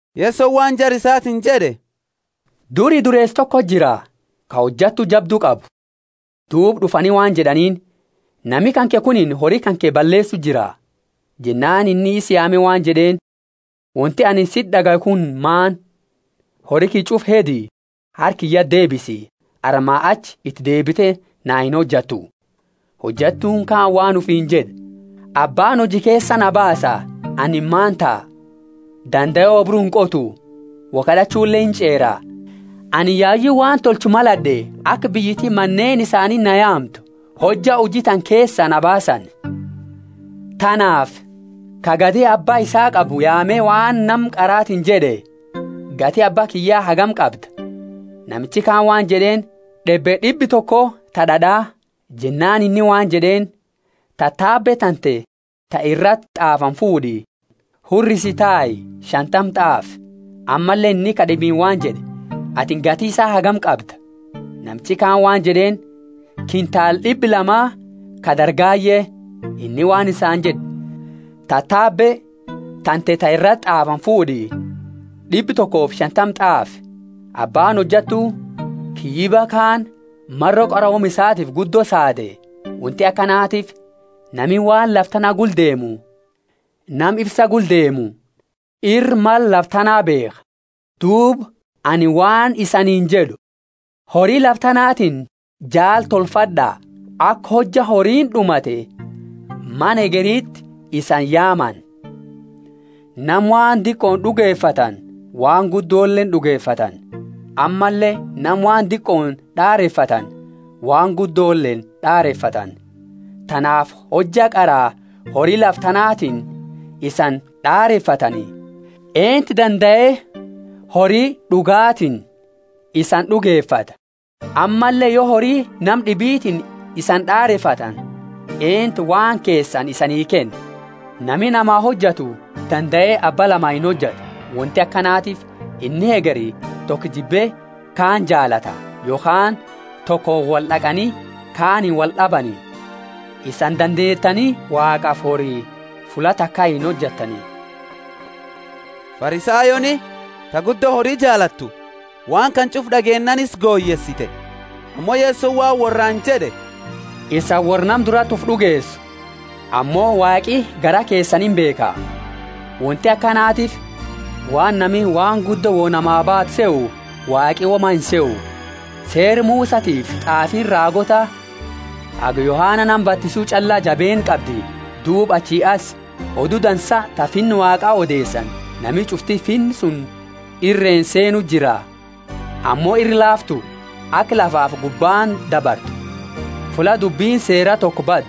Yesoni waan jara isaatiini jed'e, Duri dureesa tokoti jira, ka hojattu jabdu qabu. Duuba d'ufani waan jed'aniini, Nami kanke kunini hori kanke balleesu jira. Jennaani inni isa yaame waan jed'eeni, Wonti anini siti d'agayu kuni maani? Hori kiyya ch'ufa hedi, harka kiyyati deebisi, armaa achi iti deebite na inhojattu. Hojattuuni kaani waan ufiini jed'e, Abbaani huji keesaa na baasa, anini maani taha? Dandae oobru inqotu, woi kad'achule inch'eera. Anini yayu waan tolchu malad'e aka biyyiti maneeni isaaniti na yaamtu, hojja huji tana keesaa na baasani. Tanaafi nama ch'ufa ka gati abba isaa qabu yaame waan nama qaratiini jed'e, Gati abba kiyya hagami qabda? Namichi kaani waan jed'eeni, D'ebbe d'ibba toko ta d'ad'a. Jennaani inni waan jed'eeni, Tatabe tante ta irati t'aafani fuud'i, hurrisi tai, shantama t'aafi. Ammalle inni ka d'ibiini waan jed'e, Atini gati isaa hagami qabda? Namichi kaani waan jed'eeni, Kintaala d'ibba lama ka dargaye. Inni waan isaani jed'e, Tatabe tante ta irati t'aafani fuud'i, d'ibba tokofi shantama t'aafi. Abbaani hojattu kiyyiba kaani maro qarooma isatiifi guddo saade; wonti akanatiifi nami waan lafa tana gula deemu nama ifsa gula deemu ira mala lafa tanaa beekha. Duuba anini waan isaniini jed'u, Hori lafa tanatiini jaala tolfad'a, aka hojja horiini d'umate mana hegeriti isani yaamani. Nama waan diqooni d'ugefatani waan guddoleeni d'ugefatani; ammalle nama waan diqooni d'arefatani waan guddoleeni d'arefatani. Tanaafi hojja qara hori lafa tanatiini isani d'arefatani eentu dandae hori d'ugatiini isani d'ugefata? Ammalle yo hori nama d'ibitiini isani d'arefatani eentu waan keesani isanii kenna? Nami nama hojatu dandae abba lama inhojatu: wonti akanatiifi inni hegeri toko jibbe kaani jaalata, yokhaani tokooni wold'aqani kaaniini wold'abani. Isani dandeetani Waaqafi hori fulla taka inhojattani. Farisayooni, ta guddo hori jaalattu, waan kana ch'ufa d'ageennaani isa goyeesite. Ammo Yesoni waan worraani jed'e, Isani worra nama durati ufi d'ugeesu, ammo Waaqi garaa keesani imbeekha; wonti akanatiifi waan nami waan guddo wo namaa baatu sehu Waaqi woma insehu. Seera Musatiifi t'aafiini raagoota haga Yohana nama batisu ch'alla jabeenna qabdi; duuba achii asi Odu Dansa ta Finna Waaqa odeesani, nami ch'ufti finna suni irreeni seenu jira. Ammo ira laaftu aka lafafi gubbaani dabartu fulla dubbini Seera toko baddu.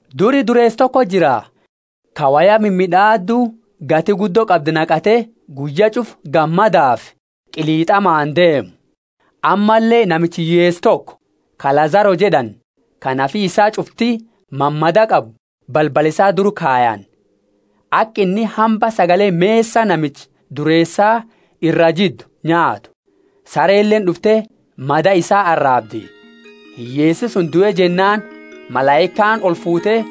Duri dureesa toko jira, ka woya mimid'aaddu gati guddo qabdu naqate guyya ch'ufa gammadafi qilit'amaani deemu. Ammalle namicha hiyyeesa toko, ka Lazaro jed'ani, ka nafi isaa ch'ufti mamadaa qabu balbala isaa dura kayani, aka inni hamba sagale mesa namicha dureesa iraa jiddu nyaatu. Sareleeni d'ufte mada isaa araabdi. Hiyyeesi suni due jennaani malaikaani olfuute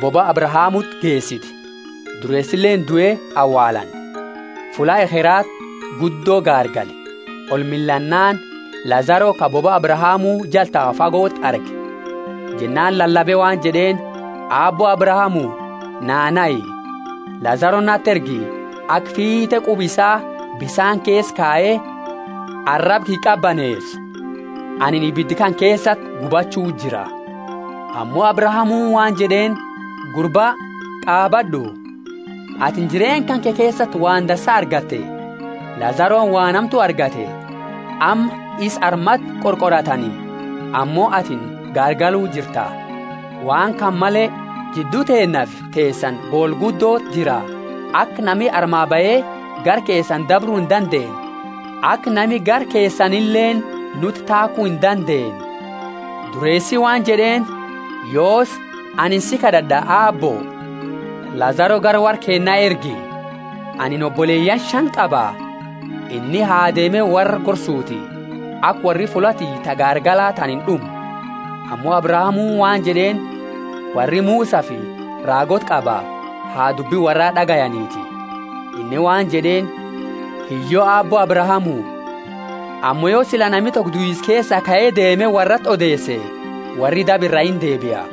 bobaa Abrahamuti geesite. Dureesileeni due awaalani. Fulla ekherati guddo gaargale; olmillaannaani Lazaro ka bobaa Abrahamu jala tau fagoti arge. Jennaani lalabe waan jed'eeni, Aabbo Abrahamu, naa nahi, Lazaro nati ergi aka fiit'e quba isaa bisaani keesa kaye araba kiyya qabaneesu; anini ibida kana keesati gubachuu jira. Ammo Abrahamuuni waan jed'eeni, Gurba, qaabad'u, atini jireenna kanke keesati waan dansa argatte, Lazaroni waan hamtu argate; amma isa armati qorqoratani ammo atini gaargalu jirta. Waan kana male, jiddu teennafi teesani boola guddoti jira, aka nami armaa bahe gara keesani dabru indandeenne, aka nami gara keesanileeni nuti taaku indandeenne. Dureesi waan jed'eeni, Yoosi, anini si kad'ad'a, Aabbo, Lazaro gara worra keenna ergi, anini oboleyaani shani qaba; inni ha deeme worra gorsuti, aka worri fulla tiyya ta gaargala tana ind'umne. Ammo Abrahamuuni waan jed'eeni, Worri Musafi raagoota qaba, ha dubbi worraa d'agayaniti. Inni waan jed'eeni, Hiyyo, Aabbo Abrahamu, ammo yo sila nami toko duisa keesaa kae deeme worrati odeese worri daba iraa deebia.